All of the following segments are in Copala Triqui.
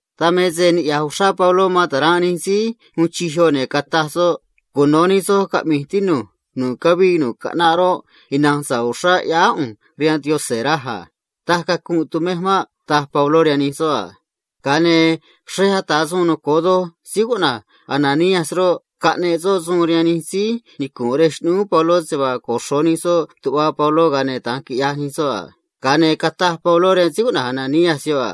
Dan me se niꞌya̱j uxrá Pabló man ta̱ranꞌ nij síí uun chij yoꞌ, ne̱ cataj soꞌ a: ―Cuno̱ nij soj caꞌmi̱j, tinu̱j. Nu̱ꞌ cavii nu̱ꞌ caꞌnaꞌ roꞌ, ina̱nj sa̱ꞌ uxrá ꞌyáá ꞌu̱nj rihaan Yaꞌanj, raj a. Taj cacunꞌ tumej maꞌ ―taj Pabló rihaan nij soꞌ a. Ga̱a ne̱ xrej ata̱ suun noco̱o doj síí cuꞌna̱j Ananías roꞌ, caꞌneꞌ soꞌ suun rihaan nij síí nicu̱nꞌ rej xꞌnúú Pabló se vaa coxro̱ nij soꞌ tuꞌva Pabló, ga̱a ne̱ da̱nj quiꞌyaj nij soꞌ a. Ga̱a ne̱ cataj Pabló rihaan síí cuꞌna̱j Ananías yoꞌ a: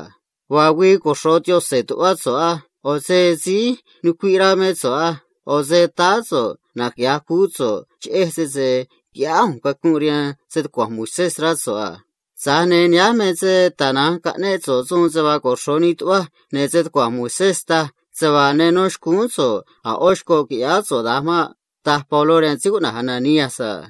―Vaa güii coxro̱ Yaꞌanj tuꞌvá so̱ꞌ á. ꞌO̱ se síí nucuiꞌ rá mé so̱ꞌ á. ꞌO̱ se táá so̱ꞌ naquiꞌya̱j cuú so̱ꞌ cheꞌej sese quiꞌyáá ꞌu̱nj cacunꞌ rihaan stucua̱nj Moisés, rá so̱ꞌ a. Tza̱j ne̱ nihánj me se tana̱nj caꞌnéꞌ so̱ꞌ suun se vaa coxro̱ nii tuꞌvaj, ne̱ stucua̱nj Moisés taj se vaa ne nó xcúún so̱ꞌ a̱ ꞌó xcoꞌ qui̱ꞌyáá so̱ꞌ da̱nj maꞌ ―taj Pabló rihaan síí cuꞌna̱j Ananías a.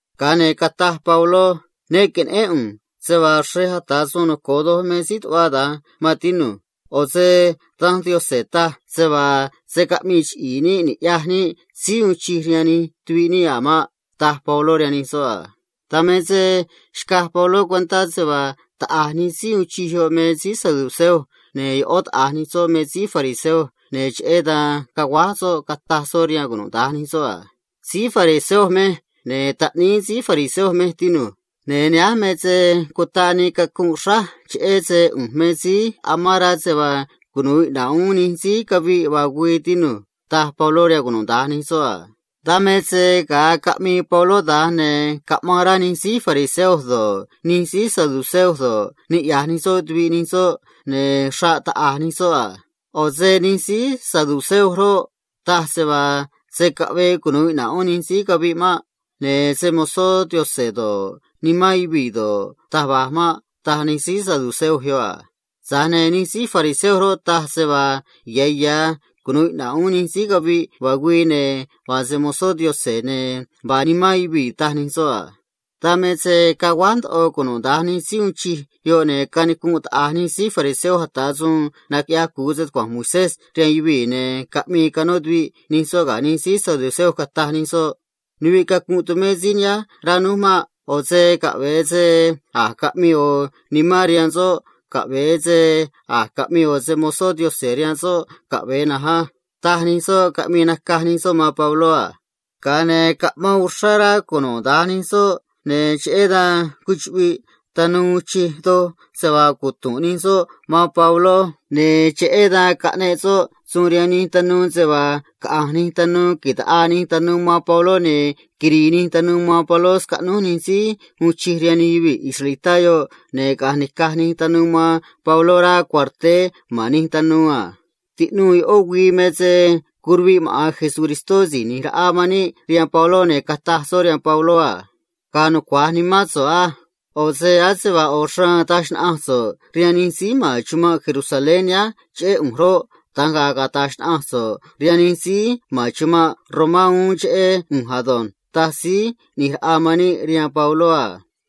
Ga̱a ne̱ cataj Pabló a: ―Ne que̱neꞌén ꞌu̱nj se vaa xrej ata̱ suun noco̱o doj me síí tuꞌva da̱nj, maan tinu̱j. ꞌO̱ se Danj Yaꞌanj taj se vaa se̱ caꞌmii chre̱e níꞌ ni̱ꞌyaj níꞌ síí uun chij rihaan nij tuvi̱ꞌ níꞌ a̱ maꞌ ―taj Pabló rihaan nij soꞌ a. Dan me se xcaj Pabló cuentá se vaa taꞌa̱j nij síí uun chij yoꞌ me síí saduceo ne̱ ꞌó taꞌa̱j nij soꞌ me síí fariseo, ne̱ cheꞌé dan caguáj soꞌ, cataj soꞌ rihaan cunuda̱nj nij soꞌ a: ―Síí fariseo mej, ne̱ taꞌníí síí fariseo mej, tinu̱j. Ne̱ nihánj me se cutaꞌ nii cacunꞌ xráj cheꞌé se ꞌu̱nj me síí naꞌvi̱j ya̱ se vaa cunu̱u iꞌna̱ꞌ uún nij síí caviꞌ vaa güii, quiꞌya̱j Yaꞌanj, tinu̱j ―taj Pabló rihaan cunuda̱nj nij soꞌ a. Dan me se ga̱a caꞌmii Pabló da̱nj, ne̱ caꞌmaan rá nij síí fariseo do̱ꞌ, nij síí saduceo do̱ꞌ, niꞌya̱j nij soꞌ tuviꞌ nij soꞌ, ne̱ xraꞌ taꞌa̱j nij soꞌ a. ꞌO̱ se nij síí saduceo roꞌ, taj se vaa se̱ caꞌvee cunu̱u iꞌna̱ꞌ uún nij síí caviꞌ maꞌ. Ne̱ se‑mo̱zó Yaꞌanj do̱ꞌ, nimán yuvii̱ do̱ꞌ, taj va̱j maꞌ, taj nij síí saduceo yoꞌ a. Tza̱j ne̱ nij síí fariseo roꞌ, taj se vaa ya̱ ya̱ cunu̱u iꞌna̱ꞌ uún nij síí caviꞌ vaa güii, ne̱ vaa se‑mo̱zó Yaꞌanj, ne̱ vaa nimán yuvii̱, taj nij soꞌ a. Dan me se caguáj ndoꞌo cunuda̱nj nij síí uun chij yoꞌ, ne̱ canicunꞌ taꞌa̱j nij síí fariseo ata̱ suun naquiꞌyaj cu̱u stucua̱nj Moisés, ne̱ caꞌmii canó tuviꞌ nij soꞌ ga̱ nij síí saduceo, cataj nij soꞌ a: ―Nuviꞌ cacunꞌ tumé síí nihánj, rá núj maꞌ. ꞌO̱ se caꞌve̱e se a̱j caꞌmii ꞌo̱ nimán rihaan soꞌ caꞌve̱e se a̱j caꞌmii ꞌo̱ se‑mo̱zó Yaꞌanj rihaan soꞌ caꞌve̱e na̱nj á ―taj nij soꞌ, caꞌmii nacaj nij soꞌ man Pabló a. Ga̱a ne̱ caꞌmaan uxrá rá cunuda̱nj nij soꞌ, ne̱ cheꞌé dan cuchuꞌviꞌ tanuu uun chij doj se vaa cutu̱nꞌ nij soꞌ man Pabló a. Cheꞌé dan caꞌneꞌ soꞌ suun rihaan nij tanuu se vaa caꞌa̱nj nij tanuu ta̱ꞌaa nij tanuu man Pabló ne̱ quiri̱i̱ nij tanuu man Pabló scaꞌnúj nij síí uun chij rihaan nij yuvii̱ israelitá yoꞌ ne̱ caꞌa̱nj ni̱caj nij tanuu man Pabló rá cuarteé ma̱n nij tanuu a. Tiꞌnuu ꞌó güii me se curuviꞌ maꞌa̱n Síí ꞌNi̱j Raꞌa man níꞌ rihaan Pabló, ne̱ cataj soꞌ rihaan Pabló a: ―Ga̱a̱ nucua̱j nimán so̱ꞌ á. ꞌO̱ se ase vaa ꞌo̱ xraan taj xnaꞌanj so̱ꞌ rihaan nij síí ma̱n chumanꞌ Jerusalén nihánj cheꞌé ꞌu̱nj roꞌ, da̱nj ga̱a̱ cata̱j xnaꞌanj so̱ꞌ rihaan nij síí ma̱n chumanꞌ Romá uún cheꞌé ꞌu̱nj ado̱nj ―taj Síí ꞌNi̱j Raꞌa man níꞌ rihaan Pabló a.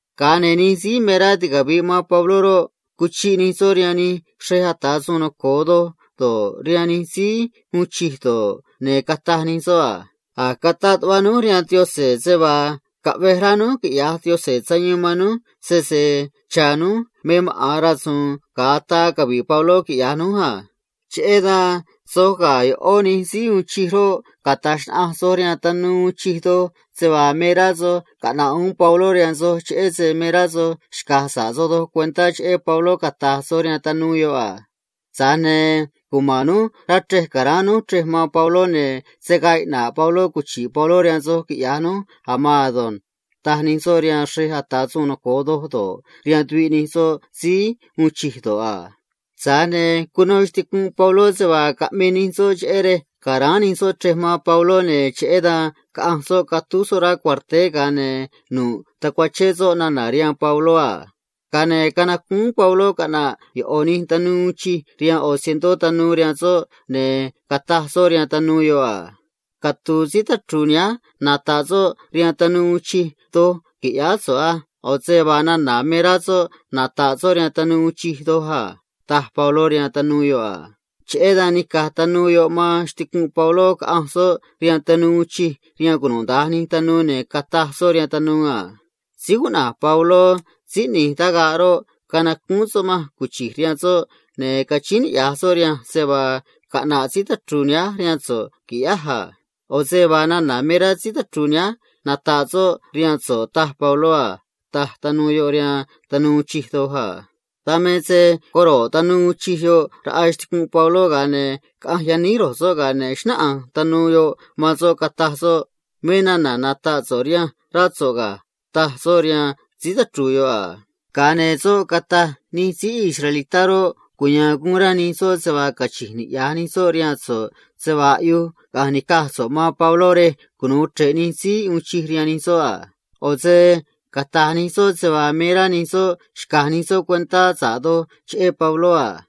Ga̱a ne̱ nij síí me rá ticavi̱ꞌ man Pabló roꞌ, cuchiꞌ nij soꞌ rihaan nij xrej ata̱ suun noco̱o do̱ꞌ, rihaan nij síí uun chij do̱ꞌ, ne̱ cataj nij soꞌ a: ―A̱j cataꞌ tuꞌva núj rihaan Yaꞌanj se vaa caꞌvej rá núj quiꞌya̱j Yaꞌanj sayuun man núj sese cha̱ núj me maꞌa̱n rasu̱u̱n ga̱a ataa cavi̱ꞌ Pabló quiꞌya̱j núj a. Cheꞌé dan soj ga̱ Xꞌneꞌ Nij Síí Ata̱ Suun Noco̱o Doj roꞌ, cata̱j xnaꞌanj soj rihaan tanuu uun chij doj se vaa me rá soj caꞌna̱ꞌ uún Pabló rihaan soj cheꞌé se me rá soj xca̱j sa̱ꞌ soj doj cuentá cheꞌé Pabló, cata̱j soj rihaan tanuu uun chij doj yoꞌ a. Tza̱j ne̱ cuma̱n núj rá chrej, ca̱ráán núj chrej man Pabló, ne̱ se̱ gaa iꞌna̱ꞌ Pabló cuchi̱ꞌ Pabló rihaan soj, quiꞌya̱j núj a̱ maan ado̱nj ―taj nij soꞌ rihaan nij xrej ata̱ suun noco̱o do̱ꞌ, rihaan tuviꞌ nij soꞌ síí uun chij do̱ꞌ a. Tza̱j ne̱ cuno xticunꞌ Pabló se vaa caꞌmii nij soꞌ cheꞌé rej ca̱ráán nij soꞌ chrej man Pabló, ne̱ cheꞌé dan caꞌanj soꞌ catúj soꞌ rá cuarteé, ga̱a ne̱ nu̱ꞌ tacuachén soꞌ nana̱ rihaan Pabló a. Ga̱a ne̱ canacúún Pabló caꞌna̱ꞌ ꞌo̱ tanuu capitán ꞌni̱j raꞌa cientó tanuu rihaan soꞌ, ne̱ cataj soꞌ rihaan tanuu capitán yoꞌ a: ―Catu̱u̱ síí tachru̱u̱ nihánj nata̱ꞌ soꞌ rihaan tanuu uun chij doj, qui̱ꞌyáá so̱ꞌ á. ꞌO̱ se vaa nana̱ me rá soꞌ nata̱ꞌ soꞌ rihaan tanuu uun chij doj a ―taj Pabló rihaan tanuu capitán yoꞌ a. Cheꞌé dan nica̱j tanuu capitán yoꞌ man xticunꞌ Pabló, caꞌanj soꞌ rihaan tanuu uun chij doj, ne̱ cataj soꞌ rihaan tanuu uun chij doj yoꞌ a: ―Síí cuꞌna̱j Pabló síí ꞌni̱j tagaꞌ roꞌ, canacúún soꞌ manj cuchi̱j rihaan soꞌ, ne̱ cachíín niꞌya̱j soꞌ rihanj se vaa caꞌna̱ꞌ síí tachru̱u̱ nihánj rihaan so̱ꞌ qui̱ꞌyáj a. ꞌO̱ se vaa nana̱ me rá síí tachru̱u̱ nihánj nata̱ꞌ soꞌ rihaan so̱ꞌ, taj Pabló a ―taj tanuu capitán yoꞌ rihaan tanuu uun chij doj a. Dan me se coro̱ꞌ tanuu uun chij yoꞌ raꞌa xticunꞌ Pabló, ga̱a ne̱ caꞌanj yaníj ro̱j soꞌ, ga̱a ne̱ xnáꞌanj tanuu yoꞌ man soꞌ, cataj soꞌ a: ―Me nana̱ nata̱ꞌ so̱ꞌ rihanj, rá so̱ꞌ ga̱ ―taj soꞌ rihaan síí tachru̱u̱ yoꞌ a. Ga̱a ne̱ soꞌ cataj a: ―Taꞌa̱j nij síí israelitá roꞌ, cuya̱a̱n guun rá nij soꞌ se vaa cachi̱nj niꞌya̱j nij soꞌ rihaan so̱ꞌ se vaa aꞌyuj caꞌa̱nj ni̱caj so̱ꞌ man Pabló rej cunu̱u chre̱ꞌ Xꞌneꞌ Nij Síí Ata̱ Suun Noco̱o Doj rihaan nij soꞌ a. ꞌO̱ se cata̱j nij soꞌ se vaa me rá nij soꞌ xca̱j sa̱ꞌ nij soꞌ doj cuentá cheꞌé Pabló a.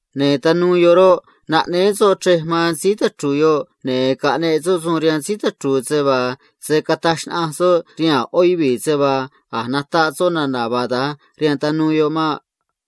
Ne̱ tanuu uun chij yoꞌ roꞌ, naꞌnéé soꞌ chrej man síí tachru̱u̱ yoꞌ a. Ne̱ caꞌneꞌ soꞌ suun rihaan síí tachru̱u̱ se vaa se̱ cataj xnaꞌanj soꞌ rihaan a̱ ꞌó yuvii̱ se vaa a̱j nataꞌ soꞌ nana̱ vaa da̱nj rihaan tanuu yoꞌ maꞌ.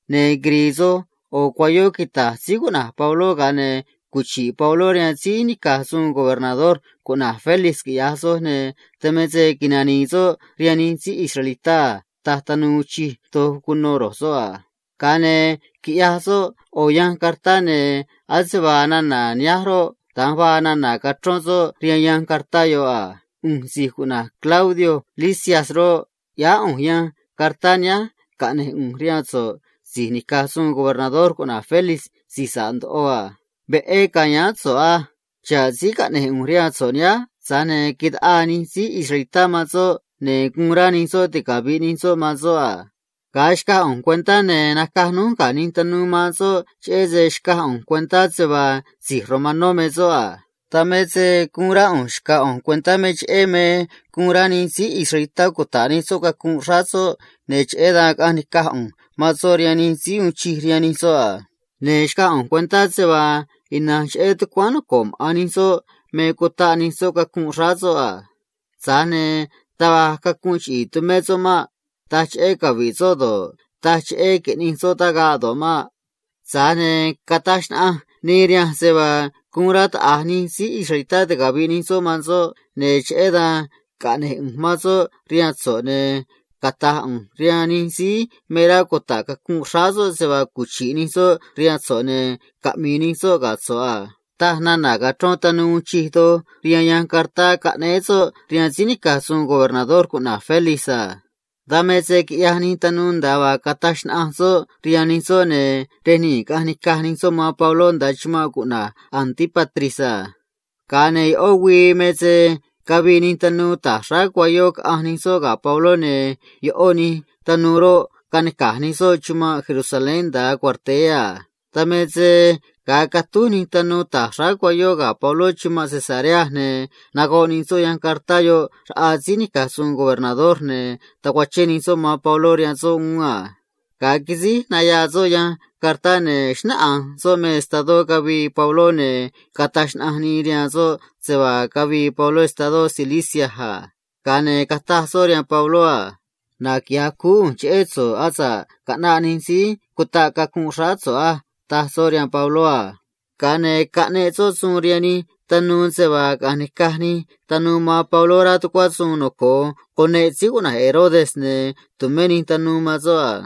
Ne̱ quiri̱i̱ soj cuayó quita̱j síí cuꞌna̱j Pabló, ga̱a ne̱ cuchi̱ꞌ Pabló rihaan síí nica̱j suun gobernador cuꞌna̱j Félix, quiꞌya̱j soj, ne̱ dan me se nani̱i̱ soꞌ rihaan nij síí israelitá a ―taj tanuu uun chij doj cuno ro̱j soꞌ a. Ga̱a ne̱ quiꞌyaj soꞌ ꞌo̱ yanj cartá, ne̱ ase vaa nana̱ nihánj roꞌ, da̱nj vaa nana̱ cachrón soꞌ rihaan yanj cartá yoꞌ a: “ꞌU̱nj si̱j cuꞌna̱j Claudio Lisias roꞌ, ꞌyáá ꞌu̱nj yanj cartá nihánj caꞌne̱j ꞌu̱nj rihaan so̱ꞌ si̱j nica̱j suun gobernador cuꞌna̱j Félix si̱j sa̱ꞌ ndoꞌo a. Veꞌé ca̱yáán so̱ꞌ á. Xa̱ꞌ síí caꞌne̱j ꞌu̱nj rihaan so̱ꞌ nihánj, tza̱j ne̱ taꞌaa nij síí israelitá man soꞌ, ne̱ guun rá nij soꞌ ticavi̱ꞌ nij soꞌ man soꞌ a. Ga̱a xcaj ꞌu̱nj cuentá, ne̱ nacaj núj ga̱ nij tanuu man soꞌ, cheꞌé se xcaj ꞌu̱nj cuentá se vaa si̱j romanó me soꞌ a. Dan me se guun rá ꞌu̱nj xca̱j ꞌu̱nj cuentá me cheꞌé me guun rá nij síí israelitá cuta̱ꞌ nij soꞌ cacunꞌ xráá soꞌ, ne̱ cheꞌé dan caꞌanj nica̱j ꞌu̱nj man soꞌ rihaan xꞌneꞌ nij síí ata̱ suun noco̱o doj rihaan maꞌa̱n nij soꞌ a. Ne̱ xcaj ꞌu̱nj cuentá se vaa ina̱nj cheꞌé tucuáán noco̱ꞌ maꞌa̱n nij soꞌ me cutaꞌ nij soꞌ cacunꞌ xráá soꞌ a. Tza̱j ne̱ taj va̱j cacunꞌ chiꞌi̱i̱ tumé soꞌ maꞌ. Taj cheꞌé cavi̱ꞌ soꞌ do̱ꞌ, taj cheꞌé qui̱ꞌnij soꞌ tagaꞌ do̱ꞌ maꞌ. Tza̱j ne̱ cataj xnaꞌanj nii rihanj se vaa guun rá taꞌa̱j nij síí israelitá ticavi̱ꞌ nij soꞌ man soꞌ a. Cheꞌé dan caꞌne̱j ꞌu̱nj man soꞌ rihaan so̱ꞌ, ne̱ cata̱j ꞌu̱nj rihaan nij síí me rá cuta̱ꞌ cacunꞌ xráá soꞌ se vaa cuchi̱ꞌ nij soꞌ rihaan so̱ꞌ ne̱ caꞌmi̱i̱ nij soꞌ ga̱ so̱ꞌ a”, taj nana̱ cachrón tanuu uun chij doj rihaan yanj cartá caꞌnéé soꞌ rihaan síí nica̱j suun gobernador cuꞌna̱j Félix a. Dan me se quiꞌyaj nij tanuu nda̱a vaa caꞌneꞌ soꞌ suun rihaan nij soꞌ, ne̱ rej nii̱ caꞌanj nica̱j nij soꞌ man Pabló nda̱a chumanꞌ cuꞌna̱j Antípatris a. Ga̱a ne̱ ꞌó güii me se cavii nij tanuu ta̱j xráá cuayó, caꞌanj nij soꞌ ga̱ Pabló, ne̱ ꞌó nij tanuu roꞌ, canica̱j nij soꞌ chumanꞌ Jerusalén nda̱a cuarteé a. Dan me se ga̱a catúj nij tanuu ta̱j xráá cuayó ga̱ Pabló chumanꞌ Cesarea, ne̱ nagoꞌ nij soꞌ yanj cartá yoꞌ raꞌa síí nica̱j suun gobernador, ne̱ tacuachén nij soꞌ man Pabló rihaan soꞌ uún a. Ga̱a quisíj nayaa soꞌ yanj cartá, ne̱ xnáꞌanj soꞌ me estadó cavii Pabló, ne̱ cataj xnaꞌanj nii rihaan soꞌ se vaa cavii Pabló estadó Cilicia a. Ga̱a ne̱ cataj soꞌ rihaan Pabló a: ―Naquiꞌya̱j cuú ꞌu̱nj cheꞌé so̱ꞌ asa̱ꞌ caꞌnaꞌ nij síí cutaꞌ cacunꞌ xráá so̱ꞌ á ―taj soꞌ rihaan Pabló a. Ga̱a ne̱ caꞌneꞌ soꞌ suun rihaan nij tanuu se vaa caꞌa̱nj ni̱caj nij tanuu man Pabló rá tucuá suun noco̱o cuneꞌ rey cuꞌna̱j Herodes ne̱ tu̱mé nij tanuu man soꞌ a.